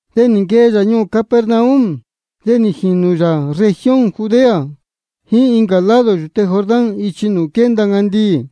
De nī nquee yā ñuū Capernaum, de nī jīnū yā región Judea jíín incā lado yūte Jordán ichi nūū quénda ncandiī.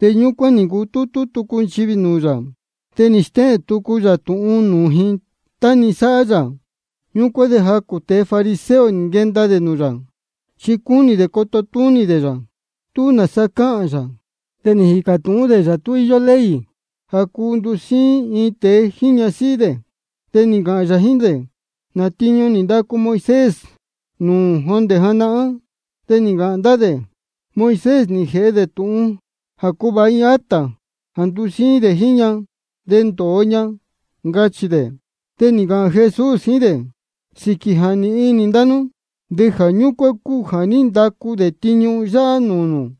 De ñúcuán nī ncutútú tucu nchivī nūū yā, de nī stéhēn tucu yā tūhun nūū ji, tá-ni sáhá yā. Ñúcuán de jacū tēe grupo fariseo nī nquenda dē nūū yā, chi cúnī dē coto túnī dē yā, tú nāsa cāhān yā. De nī jīcā tūhún dē yā tú íyó ley jā cuu ndusíín iin tēe jíín ñasíhí dē. De nī ncāhān yā jíín dē: ¿Nā tiñu nī ndacu Moisés nūū nū jondē janahán? De nī ncāhān ndá dē: Moisés nī jēhe dē tūhun jā cuvāha iin acta jā ndusíín dē jíín ña, de ndōo ña, ncachī dē. De nī ncāhān Jesús jíín dē: Sīquī jā nīhin inī ndá nú, de jā ñúcuán cúu jā ní ndacu dē tiñu yáhá nūū nū.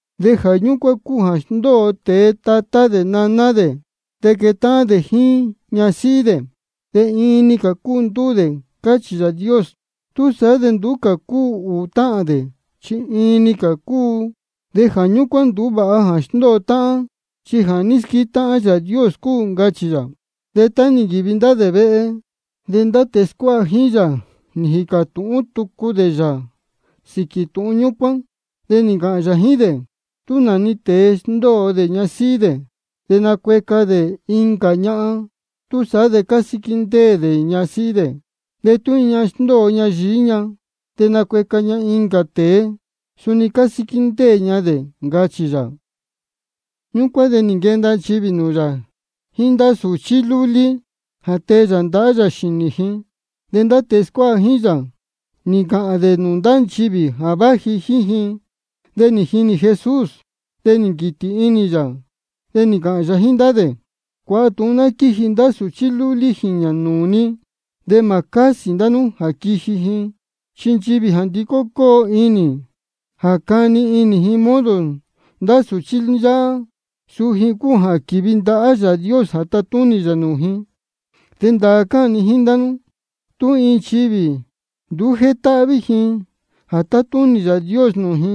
Jā ñúcuán cúu jā sndóo tēe tatá dē naná dē, de quétáhán dē jíín ñasíhí dē. De iin-ni cā cúu ndúū dē, cáchī Yāā Dios. Túsaá de nduú cā cúu ūū táhān dē, chi iin-ni cā cúu. Jā ñúcuán nduú vāha jā sndóo táhán, chi jā ní squétáhán Yāā Dios cúu, ncachī yā. De tá nī nquīvi ndá dē vehe, de ndá tēe scuáha jíín yā nī jīcā tūhún tucu dē yā sīquī tūhun ñúcuán. De nī ncāhān yā jíín dē: Tú nā-ni tēe sndóo dē ñasíhí dē, de nacueca dē incā ñahan, túsaá de cásíquí ndéē dē ñasíhí dē. De tú iin ñahan sndóo ña yií ña de nacueca ña incā tēe, suni cásíquí ndéē ña dē, ncachī yā. Ñúcuán de nī nquenda nchivī nūū yā jíín ndá sūchí lúlí, jā tee yā ndahá yā xīnī ji. De ndá tēe scuáha jíín yā, nī ncāhān dē nūū ndá nchivī jā váji jíín ji. De nī jinī Jesús, de nī nquītī inī yā, de nī ncāhān yā jíín ndá dē: Cuāha tūhun ná quíji ndá sūchí lúlí jīñā nūū ni, de mā cásī ndá nú jā quiji ji. Chi nchivī jā ndicó cóo inī jā cani inī ji modo ndá sūchí yáhá, suu ji cúu jā quīvi ndahá Yāā Dios jā tatúnī yā nūū ji. De ndāā cáhān ni jíín ndá nú, tú iin nchivī nduú jétáhví ji jā tatúnī Yāā Dios nūū ji,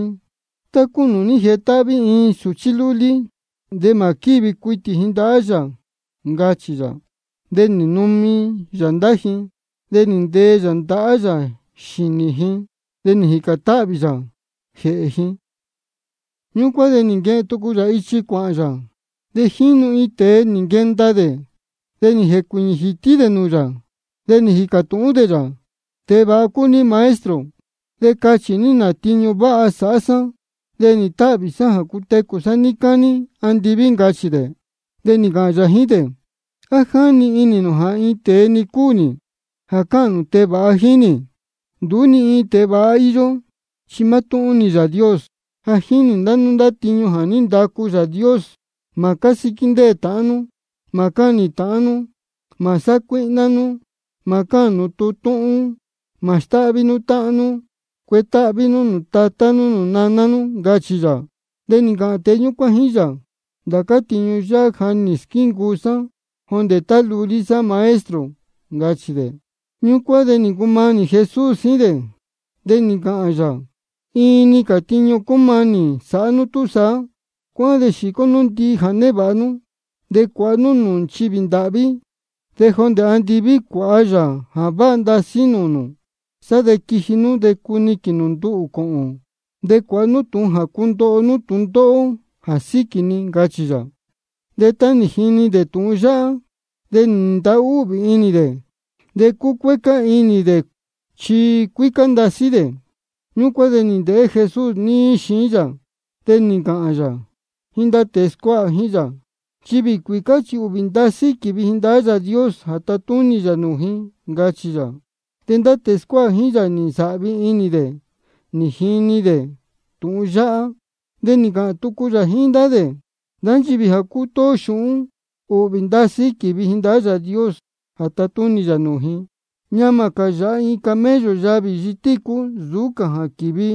tá cúu nūū jétáhví iin sūchí lúlí, de mā quívi cuitī ji ndahá yā, ncachī yā. De nī numi yā ndá ji, de nī ntee yā ndahá yā xīnī ji, de nī jīcān táhvī yā jēhē ji. Ñúcuán de nī nquehen tucu yā ichi cuāhān yā. De jínu iin tēe nī nquenda dē, de nī jēcuīñī jītí dē nūū yā, de nī jīcā tūhún dē yā: Tēe vāha cúu ní Maestro. De cachī ní, ¿nā tiñu váha sāhá sá de nīhīn táhvī sá cutecū sá níí cání andiví? ncachī dē. De nī ncāhān yā jíín dē: ¿A jáni inī nū jā iin tēe-ni cúu nī jā cáhān nū tēe vāha jíín nī? Nduú ni iin tēe vāha íyó, chi mátúhún-ni Yāā Dios. Ja jínī nū ndá tiñu jā ní ndacu Yāā Dios: Mā cásíquí ndéē tāhán nú. Mā cáhnī nū ndīyi. Mā sácuíhná nú. Mā cáhān nū tūhun túhún. Mā stáhví nú táhán nú. Cuetáhví nú nūū tatá nú nūū naná nú, ncachī yā. De nī ncāhān tēe ñúcuán jíín yā: Ndācá tiñu yáhá ja nī squíncuu sá jondē tá lulí sá, Maestro, ncachī dē. Ñúcuán de nī ncumanī Jesús jíín dē, de nī ncāhān yā: Iin-ni cā tiñu cúmanī sāhá nú túsaá: Cuáhán de xīcó ndihi nú jā névāha nú, de cuāha nú nūū nchivī ndāhví. De jondē andiví cuāha yā jā váha ndasí nūū nū. Sá de quiji nú cuniquīn nū nduhū cōhōn, de cuāha nú tūhun jā cundoho nú tūndóhó jā síquī ni, ncachī yā. De tá nī jini dē tūhun yáhá, de nī ntahúhvī inī dē. De cúcuécá inī dē cuāhān dē, chi cuícá ndasí dē. Ñúcuán de nī ndēhé Jesús níí xiín yā, de nī ncāhān yā jíín ndá tēe scuáha jíín yā: Nchivī cuīcá chi ūhvī ndasí quívi ji ndahá Yāā Dios jā tatúnī yā nūū ji, ncachī yā. De ndá tēe scuáha jíín yā nī nsāhvi inī dē nī jini dē tūhun yáhá. De nī ncāhān tucu yā jíín ndá dē: Ndá nchivī jā cútóó xūhún, ūhvī ndasí quívi ji ndahá Yāā Dios jā tatúnī yā nūū ji. Ñamā cā yāha iin camello yavī yitícú nsūú cā jā quīvi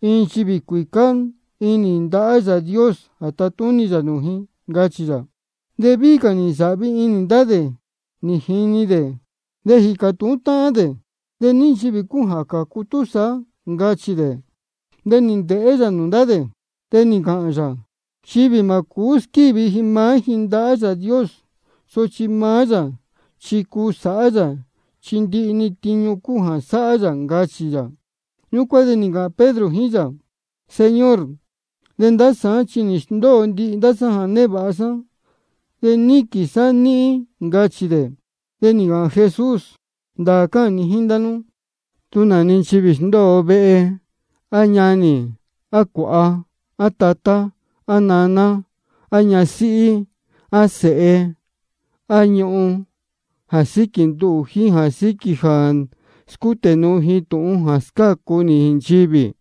iin nchivī cuīcá inī ndahá Yāā Dios jā tatúnī yā nūū ji, ncachī yā. De víhí cā nī nsāhvi inī ndá dē nī jini dē, de nī jīcā tūhún táhán dē: ¿De ní nchivī cúu jā cācu túsaá? ncachī dē. De nī ndēhé yā nūū ndá dē, de nī ncāhān yā: Nchivī chi mā cūú squívi ji maá ji ndahá Yāā Dios, sochi maá yā chi cuu sāhá yā, chi ndihi-ni tiñu cuu sāhá yā, ncachī yā. Ñúcuán de nī ncāhān Pedro jíín yā: Señor, de ndá sāán chi nī sndóo sá ndihi jā névāha sá, de níquīn sá níhín, ncachī dē. De nī ncāhān Jesús: Ndāā cáhān ni jíín ndá nú, tú nā-ni nchivī sndóo vehe, á ñanī, á cuāha, á tatá, á naná, á ñasíhí, á sēhe, á ñuhun, jā síquī nduhū jíín jā síquī jā scútē nuu ji tūhun jā scácu nī nchivī,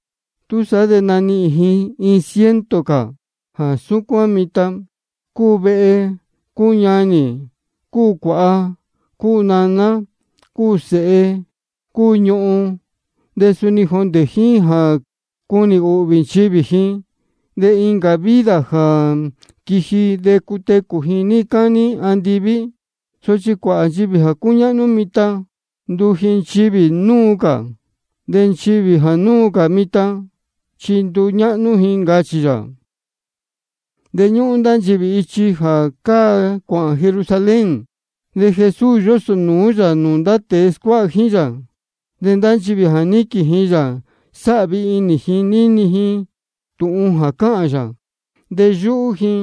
túsaá de nanihīn ji iin ciento cā jā súcuán mitan, cúu vehe, cúu ñanī, cúu cuāha, cúu naná, cúu sēhe, cúu ñuhun, de suni jondē jíín jā cunī ūhvī nchivī ji. De incā vida jā quiji de cutecū ji níí cání andiví. Sochi cuāhā nchivī jā cúñáhnú mitan, nduu ji nchivī núu cā. De nchivī jā núu cā mitan, chi nduñáhnú ji, ncachī yā. De ñúhún ndá dē ichi jā cáa cuāhān Jerusalén. De Jesús yósnūú yā nūū ndá tēe scuáha jíín yā. De ndá nchivī jā níquīn ji yā, sáhvi inī ji nī jini ji tūhun cáhān yā, de yúhú ji.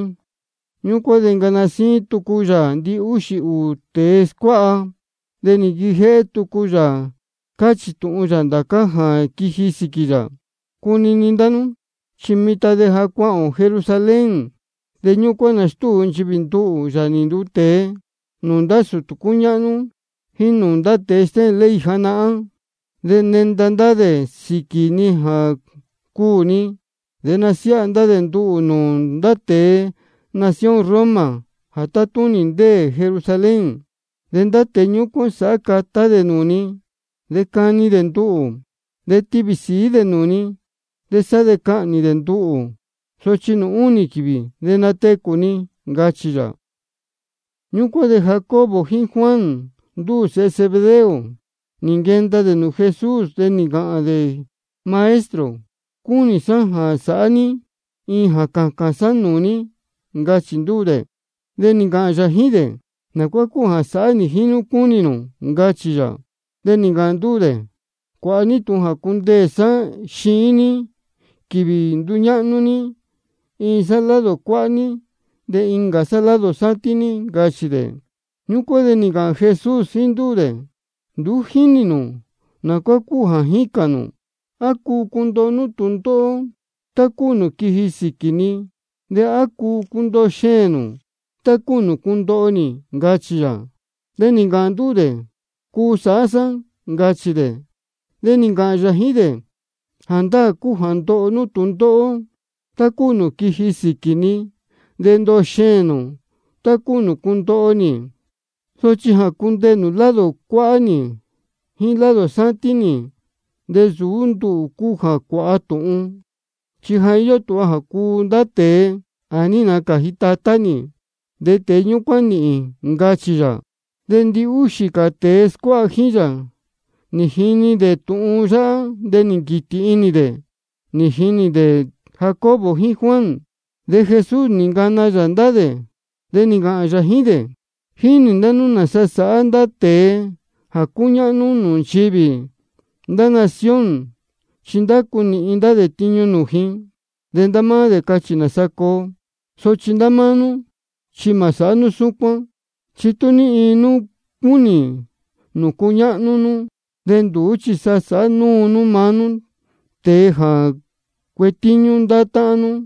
Ñúcuán de nī ncana síín tucu yā ndihúxī ūū tēe scuáha, de nī nquijéhé tucu yā cáchī tūhun yā ndācá jā quiji sīquī yā: Cunini ndá nú, chi mitan de ja cuāhān ō Jerusalén, de ñúcuán nastúu nchivī nduhū, Yāā nī nduu tēe, nūū ndá sūtū cúñáhnú jíín nūū ndá tēe stéhēn ley janahán. De nenda ndá dē sīquī ni jā cuū ni. De nasiáha dē nduhū nūū ndá tēe nación Roma jā tátúnī jā ndéē Jerusalén. De ndá tēe ñúcuán sāhá catá dē nūū ni, de cani dē nduhū, de tivī sīí dē nūū ni, de sá de cahnī dē nduhū. Sochi nūū únī quīvī de natecū ni, ncachī yā. Ñúcuán de Jacobo jíín Juan, ndúū sēhe Zebedeo, nī nquenda dē nūū Jesús, de nī ncāhān dē: Maestro, cúnī sá jā sāhá ní iin jā cācān sá nūū ní, ncachī ndúū dē. De nī ncāhān yā jíín dē: ¿Nā cuá cúu jā sāhá nī jíín nú cúnī nū? ncachī yā. De nī ncāhān ndúū dē: Cuāha ní tūhun jā cundeē sá xiín ní quīvī nduñáhnú ní, iin sá lado cuáhá ní, de incā sá lado sátín ní, ncachī dē. Ñúcuán de nī ncāhān Jesús jíín ndúū dē: Nduú jínī nū nā cuá cúu jā jícān nū. ¿A cuu cundoho nú tūndóhó tá cúu nūū quiji sīquī ni? ¿De á quenda nú cundoho xēēn nū tá cúu nūū cundoho nī? ncachī yā. De nī ncāhān ndúū dē: Cuu sāhá sá, ncachī dē. De nī ncāhān yā jíín dē: Jāndáā cúu jā ndoho nú tūndóhó tá cúu nūū quiji sīquī ni, de ndoho xēēn nū tá cúu nūū cundoho nī. Sochi jā cundeē nū lado cuáhá nī jíín lado sátín nī, de nsūú nduhū cúu jā cuāha tūhun. Chi ja íyó tūha jā cuu ndá tēe jā ní nacāji Tatá nī, de tēe ñúcuán nīhīn, ncachī yā. De ndihúxī cā tēe scuáha jíín yā, nī jini dē tūhun yáhá, de nī nquītī inī dē nī jinī dē Jacobo jíín Juan. De Jesús nī ncana yā ndá dē, de nī ncāhān yā jíín dē: Jínī ndá nú nāsa sáhá ndá tēe jā cúñáhnú nūū nchivī ndá nación. Chi ndácu nīhin ndá dē nūū ji, de maá dē cáchī nāsa coo. Sochi ndá máá nú, chi mā sāhá nú súcuán. Chi tú ní iin nú cúnī nū cuñáhnú nú, de nduú chi sa sāhá nú maá nú tēe jā cuetíñú ndá táhán nú.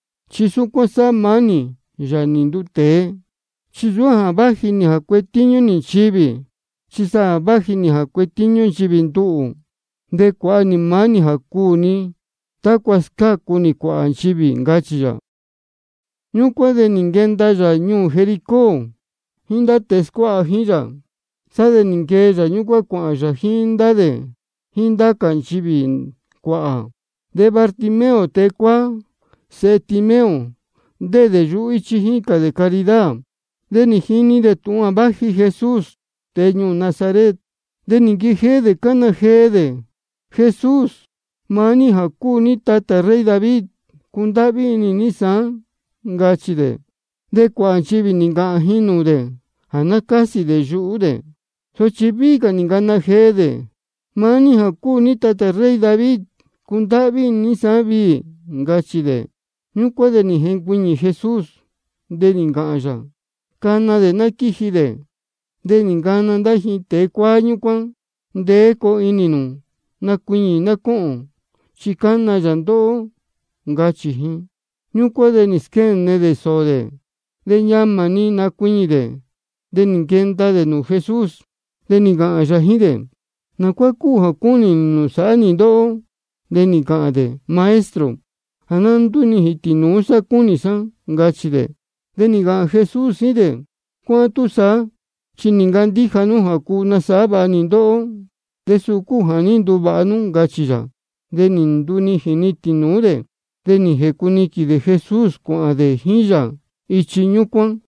Chi suni súcuán sáhá maá nī, Yāā nī nduu tēe, chi nsūú jā váji nī jā cuetíñú nī nchivī, chi sa vāji nī jā cuetíñú nchivī nduhū. De cuāha nī maá nī jā cuū ni tácua scácu nī cuāhā nchivī, ncachī yā. Ñúcuán de nī nquenda yā ñuū Jericó jíín ndá tēe scuáha jíín yā. Sá de nī nquee yā ñúcuán cuāhān yā jíín ndá dē jíín ndá cā nchivī cuāhā. De Bartimeo tēe cuáá, sēhe Timeo, ndéē dē yuhú íchí, jícān dē caridad. De nī jini dē tūhun jā váji Jesús tēe ñuū Nazaret. De nī nquijéhé dē cána jee dē: Jesús, maá ní jā cúu ní tatā rey David, cundáhví inī ní sāán, ncachī dē. De cuāhā nchivī nī ncāhān ji nūū dē jā ná cásī dē yuhú dē. Sochi víhí cā nī ncana jee dē: Maá ní jā cúu ní tatā rey David, cundáhví inī ní sāán viī, ncachī dē. Ñúcuán de nī jencuiñī Jesús, de nī ncāhān yā: Cana dē ná quíji dē. De nī ncana ndá ji tēe cuáá ñúcuán: Ndeé coo inī nū. Nacuiñī ná cóhōn, chi cána yā ndóhó, ncachī ji. Ñúcuán de nī squéne dē sōō dē, de ñamā nī nacuiñī dē, de nī nquenda dē nūū Jesús. De nī ncāhān yā jíín dē: ¿Nā cuá cúnī nū jā sāhá nī ndóhó? De nī ncāhān dē: Maestro, jā ná ndúnijīn tīnūú sá cúnī sá, ncachī dē. De nī ncāhān Jesús jíín dē: Cuáhán túsaá, chi nī ncandíja nú jā cuu nasāhá vāha nī ndóhó, de suu cúu jā ní nduvāha nú, ncachī yā. De nī ndunijīn-ni tīnūú dē, de nī jēcuniquīn dē Jesús cuāhān dē jíín yā ichi ñúcuán.